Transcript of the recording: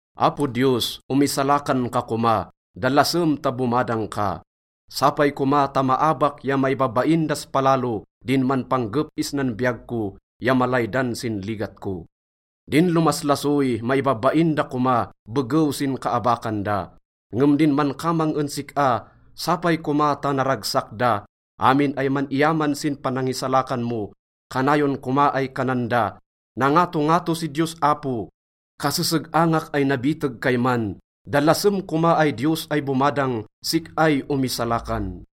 Apo Diyos, omisalakan ka koma, dalasem ta bomadang ka. Sapay koma ta maabak ya maibabain das palalo din manpanggep isnan biyag ko ya malaydan sin ligat ko. Din lomaslasoy, maibabain da koma begew sin kaabakan da. Ngem din mankamang en sik-a, sapay koma ta naragsak da. Amin ay man-iyaman sin panangisalakan mo, kanayon koma ay kanan da, “Nangatongato si Diyos Apo.” Kaseseg-angak ay nabiteg kayman, dalasem koma ay Diyos ay bomadang, sik-ay omisalakan.